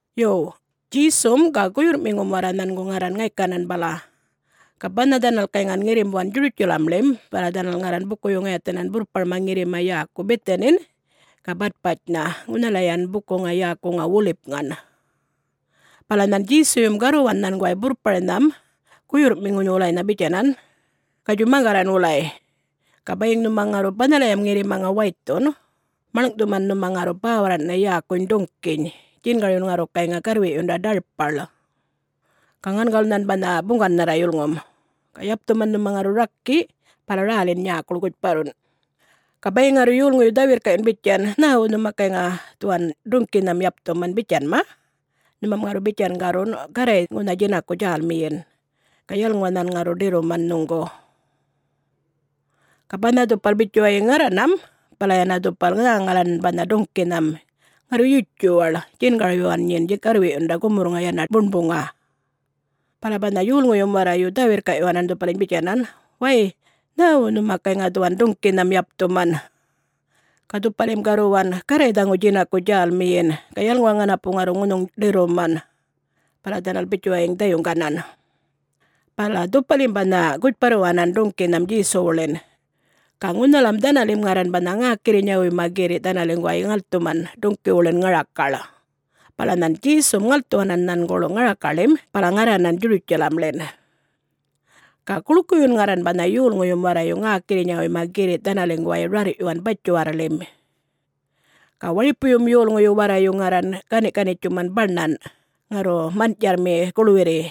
Yo, Djesum ga guyurrꞌmiŋum warra nhangu ŋarran ŋaykanan bala. Ga banha dhanal gayŋan ŋirrimbuwan Djurutjalamḻim bala dhanal ŋarran bukuyu ŋayathanan burrparma ŋirrima yäku Bithanin ga Batpatjnha ŋunhalayan bukuŋa yäkuŋa Wolipŋan. Bala nhan Djesuyum garruwan nhanguway burrparnham guyurrꞌmiŋuny wulanynha bitjanan, “Gatjuy maŋgarran wulay. Ga bayiŋ nhuma ŋarru banhalayam ŋirrimaŋa waythun, maḻŋꞌthuman nhuma ŋarru bäwarraṉꞌnha yäkuny duŋꞌkiny djingaryun ŋarru gayŋa garrwiꞌyunda ḏarpaḻ. Ga ŋangawul nhan banha buŋgannharra yulŋum. Ga yapthuman nhuma ŋarru rakiꞌ, bala rälin nyäkuḻ gutjparrun. Ga bayiŋ ŋarru yolŋuyu dhä-wirrkaꞌyun bitjan, ‘Nhäwu nhuma gayŋa dhuwan duŋꞌkinham yapthuman?’ bitjanma, nhumam ŋarru bitjan garrun, ‘Garray ŋunha djinaku djälmiyin, ga yalŋuwa nhan ŋarru ḏirruman nhuŋgu.’” Ga banha dhupal bitjuwayiŋ ŋarranam bala yana dhupal nhäŋalan banha duŋꞌkinham, ŋarru yutjuwaḻ, djingaryuwan nyin garrwiꞌyunda gumurrŋa yana buṉbuŋa. Bala banha yolŋuyum warrayu dhä-wirrkaꞌyuwanan dhupaliny bitjanan, “Way! Nhäwu nhuma gayŋa dhuwan duŋꞌkinham yapthuman?” Ga dhupalim garruwan, “Garray dhaŋu djinaku djälmiyin, ga yalŋuwa ŋanapu ŋarru ŋunhuŋ ḏirruman.” Bala dhanal bitjuwayiŋ dhayuŋganan. Bala dhupalim banha gutjparruwanan duŋꞌkinham Djesuwuḻin. Ga ŋunhalam dhanalim ŋarran banha ŋäkirrinyawuyma girriꞌ dhanaliŋguway ŋalthuman duŋꞌkiwuḻin ŋarakaḻ, bala nhan Djesum ŋalthuwanan nhanguḻ ŋarakaḻim bala ŋarranan Djurutjalamḻin. Ga guḻkuyun ŋarran banha yolŋuyum warrayu ŋäkirrinyawuyma girri' dhanaliŋguway rarr'yuwan batjiwarrḻim. Ga waripuyum yolŋuyu warrayu ŋarran gani'-ganitjuman baṉan ŋarru man'tjarrmi guḻwirri,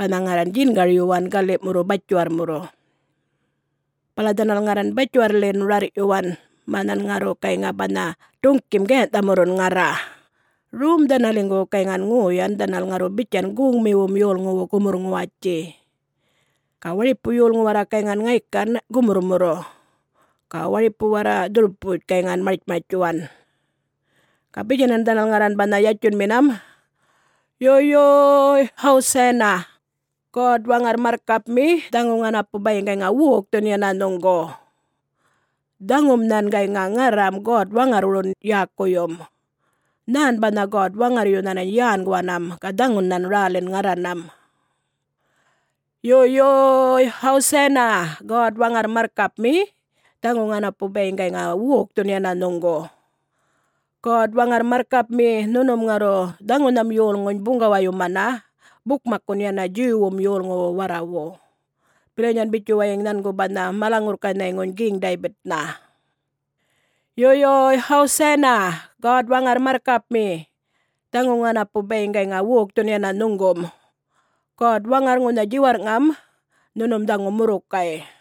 banha ŋarran djingaryuwan gali'murru batjiwarrmurru. Bala dhanal ŋarran batjiwarrḻin rarr'yuwan mä nhan ŋarru gayŋa banha duŋ'kim gayanh'thamurrun ŋarra. Rom dhanaliŋgu gayŋan ŋoyan dhanal ŋarru bitjan goŋmiwum yolŋuwu gumurr-ŋuwatji. Ga waripu yolŋu warra gayŋan ŋaykan gumurrmurru, ga waripu warra dhurputj gayŋan martjmartjtjuwan. Ga bitjanan dhanal ŋarran banha yatjunminam, “Yo yo-o-oy! Hosanna! God-Waŋarr marrkapmi, dhaŋu ŋanapu bayiŋ gayŋa wokthun yana nhuŋgu! Dhaŋum nhan gayŋa ŋarram God-Waŋarrwurun yäkuyum. Nhän banha God-Waŋarryu nhanany yänguwanam, ga dhaŋun nhan rälin ŋarranam. Yo, yo-o-oy! Hosanna! God-Waŋarr marrkapmi, dhaŋu ŋanapu bayiŋ gayŋa wokthun yana nhuŋgu! God-Waŋarr marrkapmi, nhunum ŋarru dhaŋunham yolŋuny buŋgawayumana bukmakkun yana Djuwwum yolŋuwu warrawu, bilanyan bitjuwayiŋ nhangu banha mala-ŋurrkanhayŋuny Geŋ-Daybitnha. Yo, yo-o-oy! Hosanna! God-Waŋarr marrkapmi, dhaŋu ŋanapu bayiŋ gayŋa wokthun yana nhuŋgum! God-Waŋarr, ŋunha djiwarrꞌŋam nhunum dhaŋu murrukay!”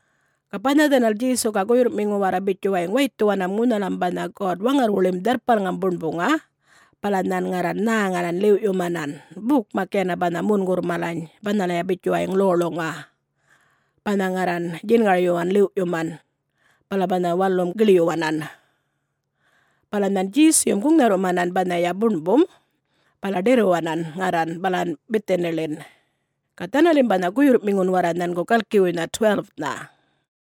Ga banha dhanal Djesu ga guyurrꞌmiŋu warra bitjuwayiŋ waythuwanam ŋunhalam banha God-Waŋarrwuḻim Dharrpalŋam Buṉbuŋa bala nhan ŋarran nhäŋalan ḻiwꞌyumanan, bukmak yana banha mungurr malany banhalaya bitjuwayiŋ ḻoḻuŋa, banha ŋarran djingaryuwan ḻiwꞌyuman. Bala banha walum giḻyuwanan, bala nhan Djesuyum guŋnharrumanan banhaya buṉbum bala ḏirruwanan ŋarran balan Bithaniḻin, ga dhanalin banha guyurrꞌmiŋun warra nhangu galkiwuynha, 12-nha.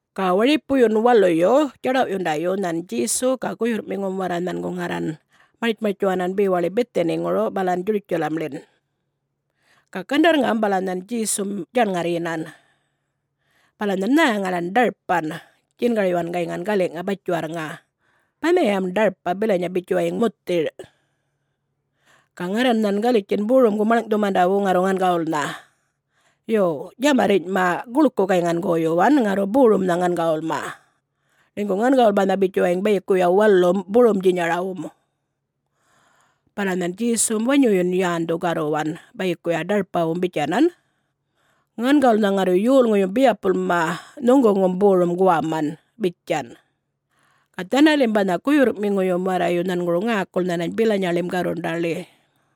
Ga waripuyun waluyu djaḏawꞌyundayu nhan Djesu ga guyurrꞌmiŋu warra nhangu ŋarran martjmartjtjuwan bewaḻi Bithaniŋuru balan Djurutjalamḻin. Ga gandarrŋam bala nhan Djesum djaṉŋarryinan. Bala nhan nhäŋalan ḏarpan, djingaryuwan gayŋan galiꞌŋa batjiwarrŋa. Banhayam ḏarpa bilanya bitjuwayiŋ muthir. Ga ŋarran nhan galitjin borumgu maḻŋꞌthumandawu ŋarru ŋangawulnha.Yo, djamarrinyꞌma guḻku gayŋan goyuwan ŋarru borumnha ŋangawulma, ḻinygu ŋangawul banha bitjuwayiŋ bayikuya walum borumdjinyarawum. Bala nhan Djesum wanyuyun yändhu garruwan bayikuya ḏarpawum bitjanan, “Ŋangawulnha ŋarru yolŋuyum biyapulma nhuŋguŋum borum guwaman!” bitjan. Ga dhanalim banha guyurrꞌmiŋuyum warrayu nhanguru ŋäkul nhanany bilanyaḻim garrundaḻi.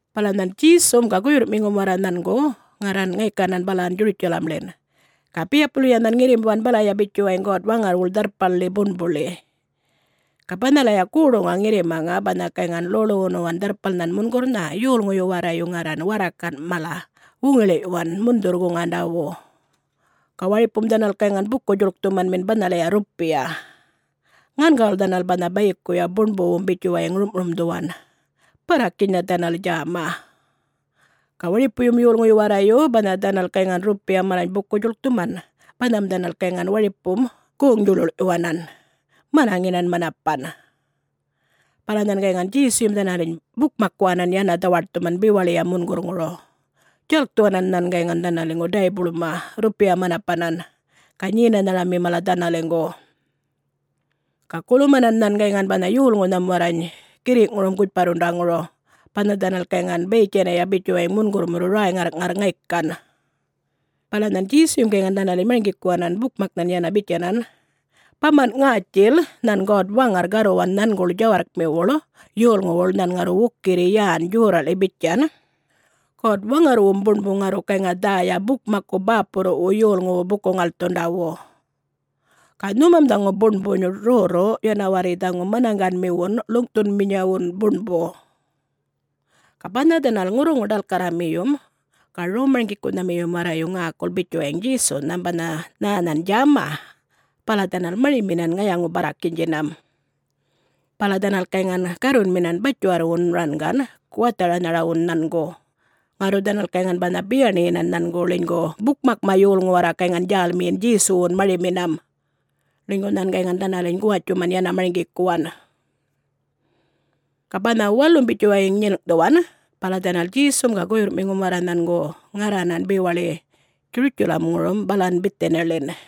Bala nhan Djesum ga guyurrꞌmiŋum warra nhangu ŋarran ŋaykanan balan Djurutjalamḻin. Ga biyapulya nhan ŋirrimbuwan balaya bitjuwayiŋ God-Waŋarrwuḻ Dharrpalḻi Buṉbuḻi. Ga banhalaya goḏuŋa ŋirrimaŋa banha gayŋan ḻoḻuwunuwan Dharrpalnhan Mungurrnha, yolŋuyu warrayu ŋarran warrakanꞌ mala wuŋiḻiꞌyuwan mundhurrwu-guŋandawu. Ga waripum dhanal gayŋan buku-djuḻkthumanmin banhalaya rrupiya. Ŋangawul dhanal banha bayikuya buṉbuwum bitjuwayiŋ rumꞌrumdhuwan, barrakinynha dhanal djäma. Ga waripuyum yolŋuyu warrayu banha dhanal gayŋan rrupiya malany buku-djuḻkthuman banham dhanal gayŋan waripum goŋ-djuḻuḻꞌyuwanan, manaŋinan manapan. Bala nhan gayŋan Djesuyum dhanaliny bukmakkuwanan yana dhawaṯthuman bewaḻiyam mungurrŋuru, djalkthuwanan nhan gayŋan dhanaliŋgu daybuḻma, rrupiya manapanan ga nyenanharamin mala dhanaliŋgu. Ga gulumanan nhan gayŋan banha yolŋunham warrany girriꞌŋurum gutjparrundaŋuru, banha dhanal gayŋan bayitjaniya bitjuwayiŋ mungurrmurru räy-ŋarrꞌŋarr ŋaykan. Bala nhan Djesuyum gayŋan dhanaliny marŋgikuwanan bukmaknhan yana bitjanan, “Bamanꞌ ŋätjil nhan God-Waŋarr garruwan nhanguḻ djawarrkmiwuḻ yolŋuwuḻ nhan ŋarru wukirri yän djorraꞌḻi bitjan, ‘God-Waŋarrwum Buṉbu ŋarru gayŋa dhäya bukmakku bäpurruwu yolŋuwu buku-ŋalthundawu.’ Ga nhumam dhaŋu Buṉbuny rrorru, yanawarri dhaŋu manaŋganmiwun ḻuŋꞌthumanminyawun buṉbu.” Ga banha dhanal ŋurruŋu-ḏalkarramiyum ga rom-marŋgikunhamiyum warrayu ŋäkul bitjuwayiŋ Djesunham banha nhä nhan djäma, bala dhanal mariminan ŋayaŋu-barrakinydjinam. Bala dhanal gayŋan garrunminan batjiwarrwun rangan guwatharanharawun nhangu, ŋarru dhanal gayŋan banha biyaṉiyin nhangu ḻinygu bukmakma yolŋu warra gayŋan djälmiyinan Djesuwum mariminan, ḻinygu nhan gayŋan dhanaliny ŋuwatjuman yana marŋgikuwan. Ga banha walum bitjuwayiŋ nyilŋꞌthuwan bala dhanal Djesum ga guyurrꞌmiŋum warra nhangu ŋarranan bewaḻi Djurutjalamŋurum balan Bithaniḻin.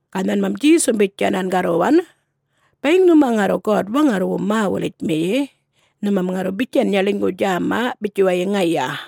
Ga nhanmam Djesum bitjanan garruwan, “Bayiŋ nhuma ŋarru God-Waŋarrwum mä-wulitmiyi, nhumam ŋarru bitjanya ḻinygu djäma bitjuwayiŋ ŋaya.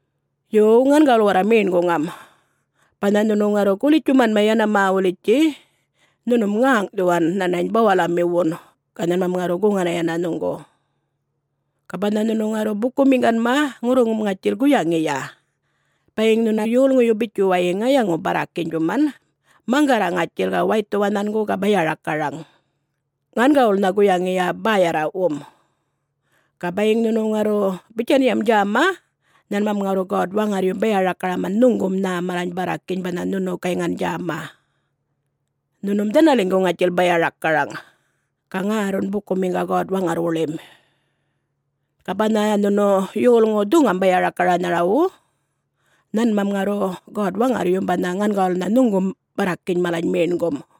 Yo, ŋangawul warra meṉguŋam. Banha nhunu ŋarru gulitjtjumanma yana mä-wulitjtji, nhunum ŋäŋꞌthuwa nhanany bawalamiwun, ga nhanmam ŋarru guŋana yana nhuŋgu. Ga banha nhunu ŋarru bukumiŋganma, ŋurruŋum ŋatjil guyaŋiya: Bayiŋ nhuna yolŋuyu bitjuwayiŋ ŋayaŋu-barrakinydjuman, maŋgarra ŋatjil ga waythuwa nhangu ga baya-rakaraŋan, ŋangawulnha guyaŋiya bäyarraꞌwum. Ga bayiŋ nhunu ŋarru bitjanyam djäma, nhanmam ŋarru God-Waŋarryum baya-rakaraman nhuŋgum nhä malany barrakiny banha nhunu gayŋan djäma. Nhunum dhanaliŋgu ŋatjil baya-rakaraŋ, ga ŋärrun bukumiŋga God-Waŋarrwuḻim. [Ga banha nhunu yolŋu dhuŋam baya-rakaranharawu, nhanmam ŋarru God-Waŋarryum banha ŋangawulnha nhuŋgum barrakiny malany meṉgum.]”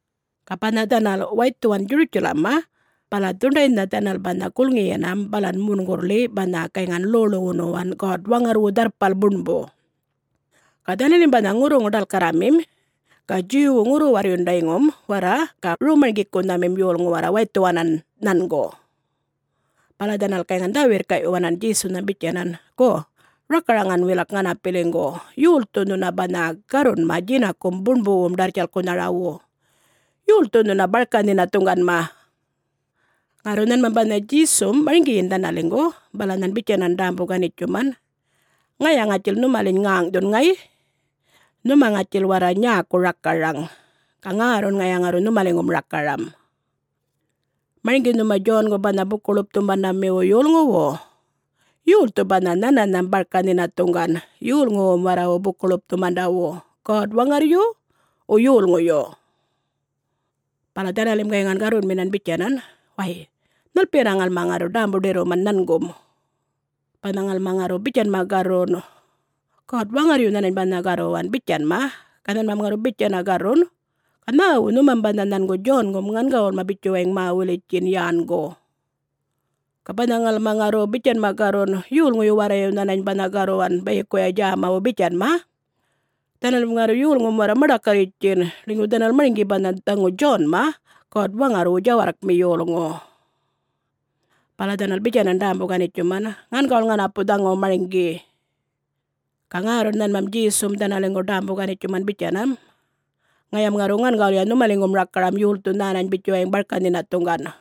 Ga banha dhanal waythuwan Djurutjaḻamma bala dhuṉḏaynha dhanal banha gulŋiyanam balan mungurrḻi banha gayŋan ḻoḻuwunuwan God-Waŋarrwu Dharrpal Buṉbu. Ga dhanalim banha ŋurruŋu-ḏalkarramim ga Djuwwu-ŋurru-warrundayŋum warra ga rom-marŋgikunharamim yolŋu warra waythuwanan nhangu, bala dhanal gayŋan dhä-wirrkaꞌyuwanan Djesunhan bitjanan, “Gu, rakaraŋan wilak ŋanapiliŋgu, yolthu nhuna banha garrunma djinakum buṉbuwum ḏarrtjalkkunharawu? Yolthu nhuna barka-nhinathuŋganma?” Ŋarru nhanmam banha Djesum marŋgiyin dhanaliŋgu. Bala nhan bitjanan ḏämbu-ganitjuman, “Ŋaya ŋatjil nhumaliny ŋäŋꞌthun ŋayꞌ. Nhuma ŋatjil warra nyäku rakaraŋ, ga ŋärrun ŋaya ŋarru nhumaliŋgum rakaram. Marŋgi nhuma Djongu, banha Buku-ḻupthumandamiwum yolŋuwu? Yolthu banha nhananham barka-nhinathuŋgan yolŋuwum warrawu buku-ḻupthumandawu? God-Waŋarryu, wo yolŋuyu?” Bala dhanalim gayŋan garrunminan bitjanan, “Way, nhalpiyana ŋalmam ŋarru ḏämbu-ḏirruman nhangum? Banha ŋalma ŋarru bitjanma garrun, ‘God-Waŋarryu nhanany banha garruwan,’ bitjanma, ga nhanmam ŋarru bitjana garrun, ‘Ga nhäwu nhumam banha nhangu Djongum ŋangawulma bitjuwayiŋ mä-wulitjtjin yängu?’ Ga banha ŋalma ŋarru bitjanma garrun, ‘Yolŋuyu warrayu nhanany banha garruwan bayikuya djämawu,’ bitjanma, dhanalim ŋarru yolŋum warra maḏakarritjtjin, ḻinygu dhanal marŋgi banha dhaŋu Djonma God-Waŋarrwu djawarrkmi yolŋu.” Bala dhanal bitjanan ḏämbu-ganitjuman, “Ŋangawul ŋanapu dhaŋu marŋgi!” Ga ŋärrun nhanmam Djesum dhanaliŋgu ḏämbu-ganitjuman bitjanam, “Ŋayam ŋarru ŋangawulya nhumaliŋgum rakaram yolthu nhänany bitjuwayiŋ barka-nhinathuŋgan.”